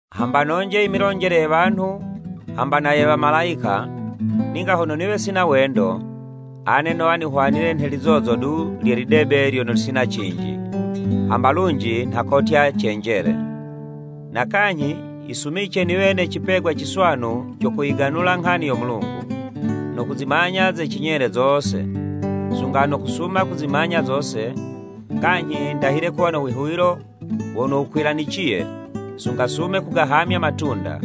Hamba nonje i milonjele ye wanhu hamba na ye Wamalayika, ninga hono niwe sina wendo, ane nowa nihwanile nhe lizozo du lye lidebe lyono lisina cinji, hamba lunji nha kotya cenjele. Na kanyhi yisumice niwe ne cipegwa ciswanu co kuyiganula nghani yo Mulungu, no kuzimanya ze cinyele zose, sunga no kusuma kuzimanya zose, kanyhi ndahile kuwa no wihuwilo wono wukwilaniciye, sunga sume kugahamya matunda,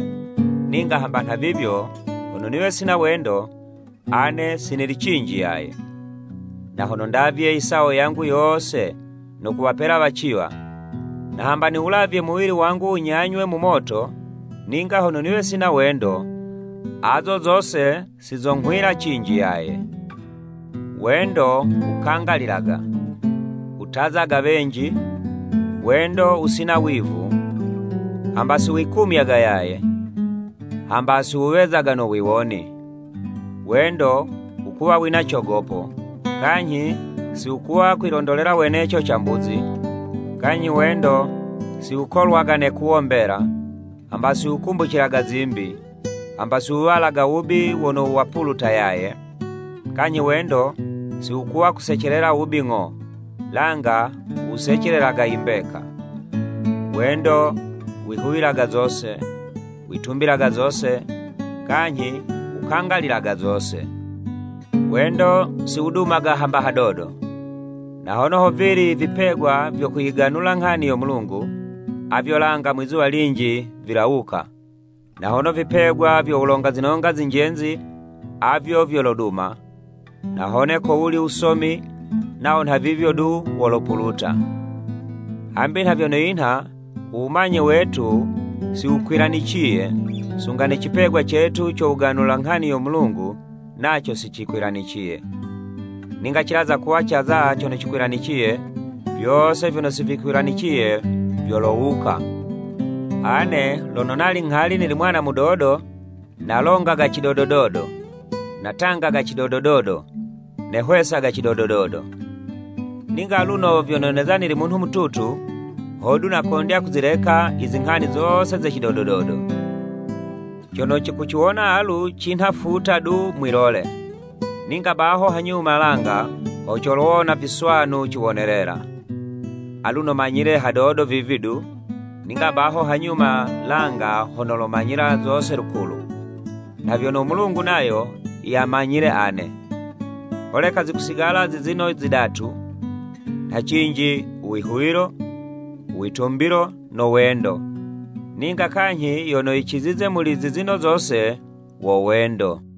ninga hamba nha vivyo hono niwe sina wendo, ane si nili cinji yaye. Na hono ndavye i sawo yangu yose no kuwapela waciwa, na hamba niwulavye muwili wangu wunyanywe mu moto, ninga hono niwe sina wendo, azo zose si zonghwila cinji yaye. Wendo wukangalilaga, wutazaga wenji, wendo wusina wivu, hamba si wikumyaga yaye, hamba siwuwezaga no wiwoni. Wendo wukuwa wina cogopo, kanyhi si wukuwa kwilondolela weneco cambuzi, kanyhi wendo si wukolwaga ne'kuwo mbela, hamba si wukumbucilaga zimbi, hamba si wuwalaga wubi wono wapuluta yaye, kanyhi wendo si wukuwa kusecelela wubi ng'o, langa wusecelelaga i mbeka. Wendo wihuwilaga zose, witumbilaga zose, kanyhi wukangalilaga zose. Wendo si wudumaga hamba hadodo. Na hone hovili i vipegwa vyo kuyiganula nghani yo Mulungu, avyo langa mwizuwa linji vilawuka, na hone vipegwa vyo wulonga zinonga zinjenzi, avyo vyoloduma, na hone kowuli wusomi, nawo nha vivyo du wolopuluta. Hambi nha vyono yinha u wumanye wetu si wukwilaniciye, sunga ne cipegwa cetu co wuganula nghani yo Mulungu naco si cikwilaniciye. Ninga cilaza kuwa caza cono cikwilaniciye, vyose vyono si vikwilaniciye vyolowuka. Ane lono nali nghali nili mwana mudodo nalongaga cidodododo, natangaga cidodododo, nehwesaga cidodododo. Ninga aluno vyono neza nili munhu mututu, hodu nakondya kuzileka i zinghani zose ze cidodododo. Cono cikuciwona alu cinha futa du mwi'lole, ninga baho hanyuma langa, ho colowona viswanu ciwonelela. Aluno manyile hadodo vivi du, ninga baho hanyuma langa, ho nolomanyila zose lukulu, nha vyono u Mulungu nayo yamanyile ane. Holeka zikusigala zizino zidatu, nha cinji, u Wihuwilo, u Witumbilo no wendo, ninga kanyhi yono yicizize muli zizino zose, wo wendo.